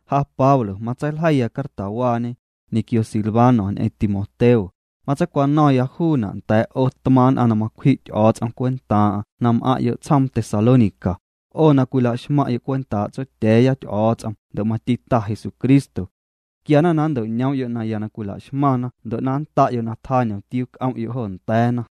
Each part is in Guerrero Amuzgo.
Ja Pablo matseiljeiya cartawaañe, ñequio Silvano ñ'eⁿ Timoteo, matseicwano̱ⁿya juuna' nda̱a̱' 'o tmaaⁿ' nn'aⁿ na macwji' Ty'o̱o̱ts'om cwentaaⁿ'aⁿ na m'aⁿ'yo' tsjoom Tesalónica, 'o na cwila'xmaⁿyo' cwentaa' Tsotya̱a̱ya Ty'o̱o̱ts'om ndo' mati Ta Jesucristo. Quiana na nnto'ñoom'yo' naya na cwila'xmaⁿna ndo' na nnda'yo' na tjaa ñomtiuu c'om'yo' jo nda̱a̱na.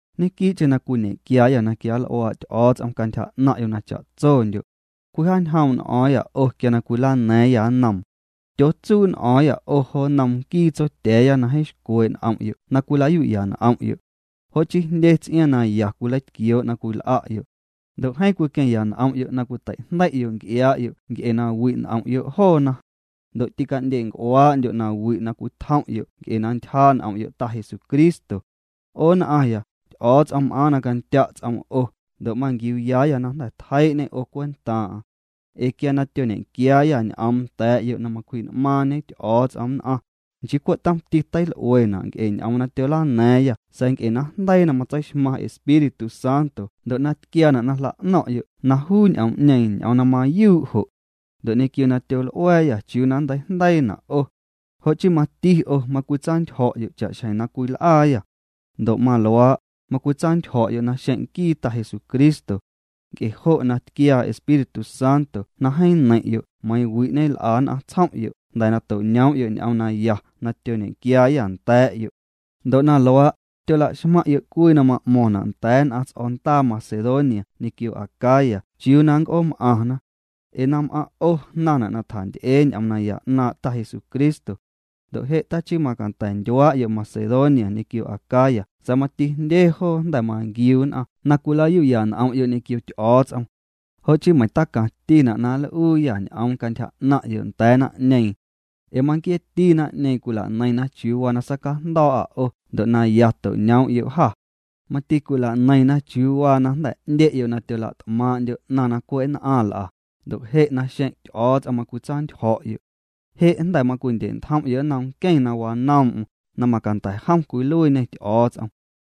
Ñenquii'cheⁿ na cwiñe'quiaayâ na quianl'uaa' Ty'o̱o̱ts'om cantyja 'naⁿ'yo' na cha'tsondyo'. Cwijaañjoom' n'o̱o̱ⁿyâ 'o quia na cwilana̱a̱ⁿyâ nnoom. Tyootsuu' n'o̱o̱ⁿyâ 'o jo nnom nquii Tsotya̱a̱ya na jeeⁿ xcwee' n'om'yo' na cwila'yu'ya n'om'yo'. Jo' chii jndye ts'iaaⁿ na ya cwileitquioo' na cwil'a'yo'. Ndo' jeeⁿ cwiqueⁿya n'om'yo' na cwitei'jndei'yo' nc'iaa'yo' nc'e na wi' n'om'yo' joona. Ndo' tîca'ndye'nc'uaa'ndyo' na wi' na cwitjom'yo' nc'e na ntyjaa' n'om'yo' Ta Jesucristo. 'O nn'aaⁿya, Ty'o̱o̱ts'om m'aaⁿ na candya' ts'oom 'o, ndo' manquiuuyaayâ na jnda̱ tjeii'ñê 'o cwentaaⁿ'aⁿ. Ee quia tyoñequiaayâ ñ'oom nda̱a̱'yo' na macwji'n'maaⁿ'ñe Ty'o̱o̱ts'om nn'aⁿ, nchii cwe' tomti teil'uena' nc'e ñ'oom na tyolana̱a̱ⁿyâ sa̱a̱ nc'e najndeii na matseixmaⁿ Espíritu Santo ndo' na tquiaana' na jla'no̱ⁿ'yo' na juu ñ'oom'ñeeⁿ ñ'oom na mayuu' jo'. Ndo' ñequio na tyol'ua̱a̱yâ chiuu na nnteijndeiina' 'o. Jo' chii mati 'o macwitsantyjo̱'yo' cha'xjeⁿ na cwil'aayâ. Ndo' maluaa', macwitsantyjo̱'yo' naxeⁿ' nquii Ta Jesucristo. Nc'e jo' na tquiaa Espíritu Santo na jeeⁿ neiⁿ'yo' meiiⁿ wi' ñel'a nn'aⁿ tsjom'yo' jnda̱ na to'ñoom'yo' ñ'oom naya na tyoñequiaayâ nda̱a̱'yo'. Ndo' na luaa', tyolaxmaⁿ'yo' cwii na ma'mo̱ⁿna' nda̱a̱ nn'aⁿ ts'o̱ndaa Macedonia ñequio Acaya chiuu na nnc'oom'aⁿna. Ee na m'aⁿ' 'o jnaⁿna' na tjanty'ee ñ'oom naya 'naaⁿ' Ta Jesucristo. Ndo' je' tachii macanda̱ ndyuaa'yo' Macedonia ñequio Acaya sa̱a̱ mati jndye joo jnda̱ manquiu nn'aⁿ na cwila'yu'ya n'om'yo' ñequio Ty'o̱o̱ts'om. Jo' chii meiⁿ tacaⁿtina' na nl'uuyâ ñ'oom cantyja 'naⁿ'yo' nda̱a̱ naⁿ'ñeeⁿ. Ee manquieeti naⁿ'ñeeⁿ cwila'neiⁿna chiuu waa na sacajndo̱o̱'â 'o ndo' na ya to'ñoom'yo' jâ. Mati cwila'neiⁿna chiuu waa na jnda̱ 'ndye'yo' na tyola't'maaⁿ'ndyo' 'naⁿ na cwe' nn'aⁿ nl'a, ndo' je' naxeⁿ' Ty'o̱o̱ts'om macwitsantyjo̱'yo'. Je' jnda̱ macwindye'ntjom'yo' nnom nqueⁿ na wanoom'm, na macanda̱ jom cwiluiiñê Ty'o̱o̱ts'om.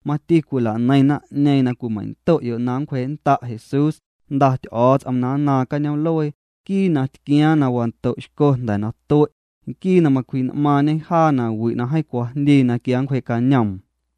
Mati cwila'neiⁿ naⁿ'ñeeⁿ na cwimeiⁿndo'yo' na nncwjee'nnda' Jesús, Jnda Ty'o̱o̱ts'om na nnaaⁿ cañoom'luee, nquii na tquiaaⁿ na wando'xco jnda̱ na tue', nquii na macwji'n'maaⁿñe jaa na wi' na jeeⁿ cwajndii na quia nncwjee'cañoom.